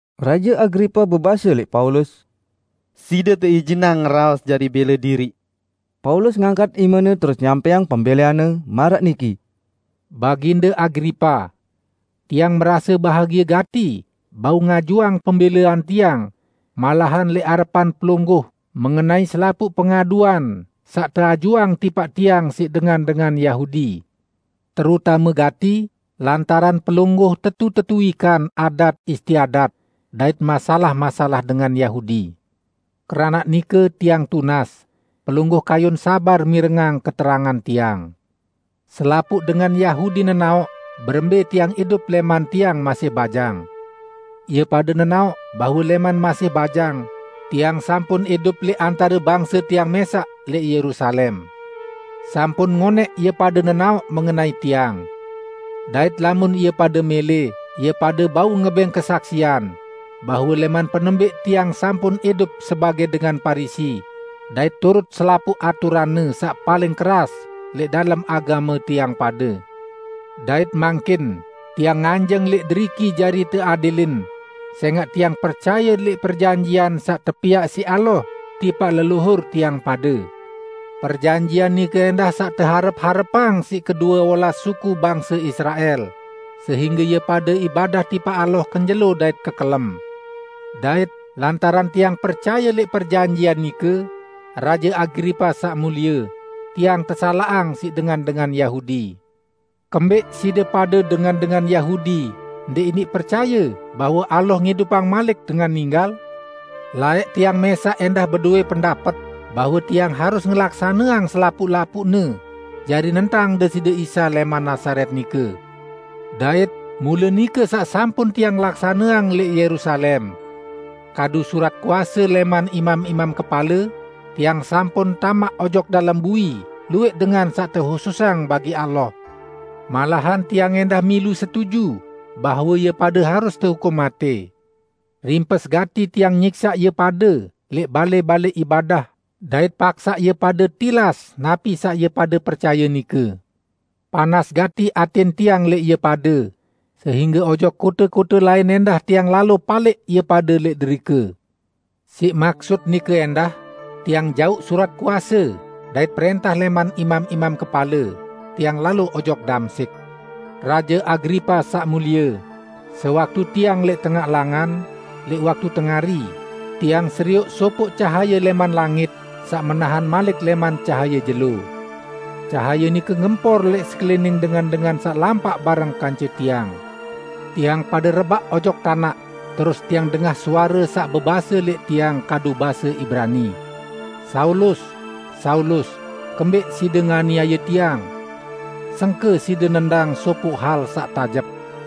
Raje Agripa bebase lẽq Paulus, "Side teijinang ngeraos jari bẽle diriq." Paulus ngangkat imene terus nyampẽang pembẽleanne, maraq niki, "Baginde Agripa! Tiang merase bahagie gati bau ngajuang pembẽlean tiang malahan lẽq arepan pelungguh mengenai selapuq pengaduan saq teajuang tipaq tiang siq dengan-dengan Yahudi; terutame gati lantaran pelungguh tetu-tetu wikan adat-istiadat dait masalah-masalah dengan Yahudi. Keranaq nike, tiang tunas pelungguh kayun sabar mirengang keterangan tiang. Selapuq dengan Yahudi nenaoq berembẽ tiang idup lẽman tiang masih bajang. Ie pade nenaoq bahwe lẽman masih bajang, tiang sampun idup lẽq antare bangse tiang mẽsaq lẽq Yerusalem. Sampun ngonẽq ie pade nenaoq mengenai tiang. Dait lamun ie pade mẽlẽ, ie pade bau ngebẽng kesaksian bahwe lẽman penembẽq tiang sampun idup sebagẽ dengan Parisi dait turut selapuq aturanne saq paling keras lẽq dalem agame tiang pade. Dait mangkin tiang nganjeng lẽq deriki jari teadilin sẽngaq tiang percaye lẽq perjanjian saq tepiaq siq Allah tipaq leluhur tiang pade. Perjanjian nike ẽndah saq teharep-harepang siq kedue olas suku bangse Israel, sehingge ie pade ibadah tipaq Allah kenjelo dait kekelem. Dait lantaran tiang percaye lẽq perjanjian nike, Raje Agripa saq mulie, tiang tesalaqang siq dengan-dengan Yahudi. Kembẽq side pade dengan-dengan Yahudi ndẽq iniq percaye bahwe Allah ngidupang malik dengan ninggal? Laẽq tiang mẽsaq ẽndah bedowẽ pendapet bahwe tiang harus ngelaksaneang selapuq-lapuqne jari nentang Deside Isa lẽman Nazaret nike. Dait mule nike saq sampun tiang laksaneang lẽq Yerusalem. Kadu surat kuase lẽman imam-imam kepale, tiang sampun tamaq ojok dalem bui luwẽq dengan saq tehususang bagi Allah. Malahan tiang ẽndah milu setuju bahwe ie pade harus tehukum matẽ. Rimpes gati tiang nyiksaq ie pade lẽq balẽ-balẽ ibadah dait paksaq ie pade tilas napi saq ie pade percaye nike. Panas gati atẽn tiang lẽq ie pade, sehingge ojok kote-kote lain ẽndah tiang lalo palẽq ie pade lẽq derike." "Siq maksut nike ẽndah, tiang jauq surat kuase dait prẽntah lẽman imam-imam kepale, tiang lalo ojok Damsyik. Raje Agripa saq mulie, sewaktu tiang lẽq tengaq langan, lẽq waktu tengari, tiang serioq sopoq cahaye lẽman langit saq menahan malik lẽman cahaye jelo. Cahaye nike ngempor lẽq sekelining dengan-dengan saq lampaq bareng kance tiang. Tiang pade rebaq ojok tanaq, terus tiang dengah suare saq bebase lẽq tiang kadu base Ibrani, 'Saulus, Saulus! Kembẽq side nganiaye Tiang? Sengke side nendang sopoq hal saq tajep.'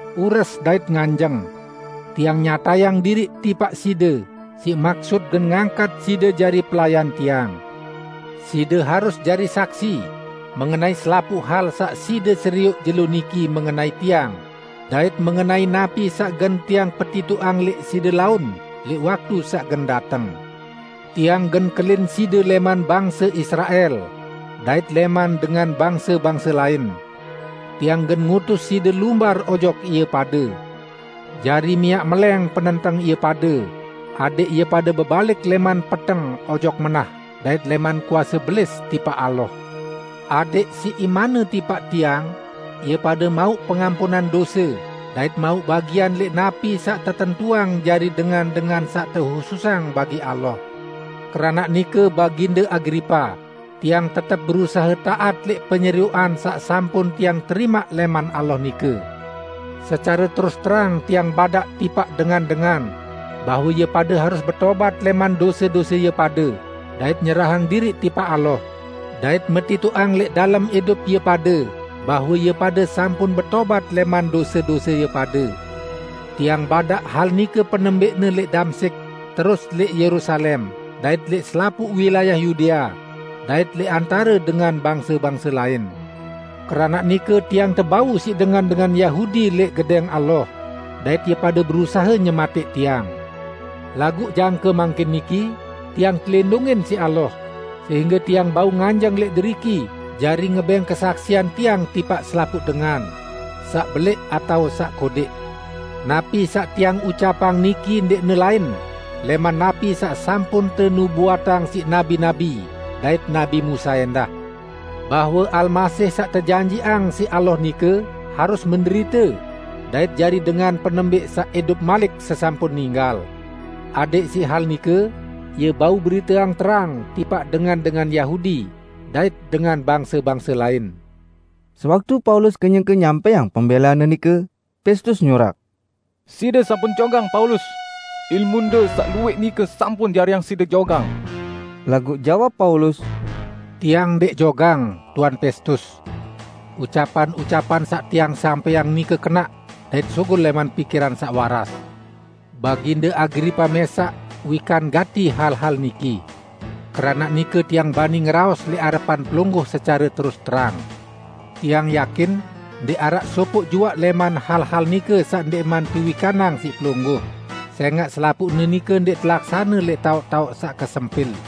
Ures dait nganjeng! Tiang nyatayang diriq tipaq side siq maksut gen ngangkat side jari pelayan Tiang. Side harus jari saksi mengenai selapuq hal saq side serioq jelo niki mengenai Tiang dait mengenai napi saq gen Tiang petitoqang lẽq side laun lẽq waktu saq gen dateng. Tiang gen kelin side lẽman bangse Israel dait lẽman dengan bangse-bangse lain. Tiang gen ngutus side lumbar ojok ie pade jari miaq melẽng penenteng ie pade, adẽq ie pade bebalik lẽman peteng ojok menah dait lẽman kuase Belis tipaq Allah. Adẽq siq imanne tipaq Tiang, ie pade mauq pengampunan dose dait mauq bagian lẽq napi saq tetentuang jari dengan-dengan saq tehususang bagi Allah.' " "Keranaq nike, Baginde Agripa, tiang tetep berusahe taat lẽq penyerioqan saq sampun tiang terimaq lẽman Allah nike. Secare terus terang tiang badaq tipaq dengan-dengan bahwe ie pade harus betobat lẽman dose-dose ie pade dait nyerahang diriq tipaq Allah, dait metitoqang lẽq dalem idup ie pade bahwe ie pade sampun betobat lẽman dose-dose ie pade. Tiang badaq hal nike penembẽqne lẽq Damsyik, terus lẽq Yerusalem dait lẽq selapuq wilayah Yudea dait lẽq antare dengan bangse-bangse lain. Keranaq nike tiang tebau siq dengan-dengan Yahudi lẽq Gedẽng Allah dait ie pade berusahe nyematẽq tiang. Laguq jangke mangkin niki tiang telindungin siq Allah, sehingge tiang bau nganjeng lẽq deriki jari ngebẽng kesaksian tiang tipaq selapuq dengan -- saq belẽq atao saq kodẽq. Napi saq tiang ucapang niki ndẽqne lain lẽman napi saq sampun tenubuatang siq nabi-nabi dait nabi Musa ẽndah; bahwe Almasih saq tejanjiqang siq Allah nike harus menderite, dait jari dengan penembẽq saq idup malik sesampun ninggal; adẽq siq hal nike Ie bau beriteang terang, tipaq dengan-dengan Yahudi dait dengan bangse-bangse lain." Sewaktu Paulus kenyeke nyampẽang pembẽleanne nike, Pestus nyurak, "Side sampun jogang Paulus! Ilmunde saq luwẽq nike sampun jariang side jogang!" Laguq jawab Paulus, "Tiang ndẽq jogang, Tuan Pestus. Ucapan-ucapan saq tiang sampẽang nike kenaq dait sugul lẽman pikiran saq waras. Baginde Agripa mẽsaq wikan gati hal-hal niki. Keranaq nike tiang bani ngeraos lẽq arepan pelungguh secare terus terang. Tiang yakin ndẽq araq sopoq juaq lẽman hal-hal nike saq ndẽqman tewikanang siq pelungguh, sẽngaq selapuqne nike ndẽq telaksane lẽq taoq-taoq saq kesempil.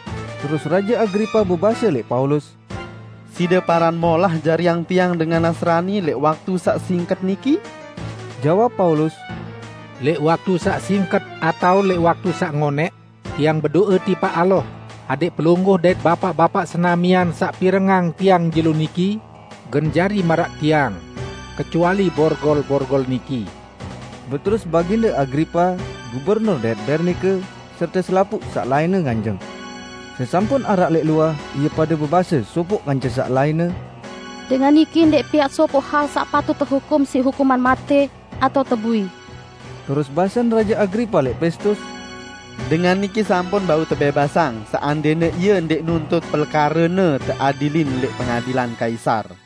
Terus Raje Agripa bebase lẽq Paulus, "Side paran molah jariang tiang dengan Nasrani lẽq waktu saq singket niki?" Jawab Paulus, "Lẽq waktu saq singket atao lẽq waktu saq ngonẽq, tiang bedo'e tipaq Allah adẽq pelungguh dait bapaq-bapaq senamian saq pirengang tiang jelo niki gen jari maraq tiang -- kecuali borgol-borgol niki!" Beterus Baginde Agripa, gubernur dait Bernike, serte selapuq saq lainne nganjeng. Sesampun araq lẽq luah, ie pade bebase sopoq kance saq lainne, "Dengan niki ndẽq piaq sopoq hal saq patut tehukum siq hukuman matẽ atao tebui." Terus basen Raje Agripa lẽq Pestus, "Dengan niki sampun bau tebẽbasang, seandẽne ie ndẽq nuntut pelekarene teadilin lẽq Pengadilan Kaisar."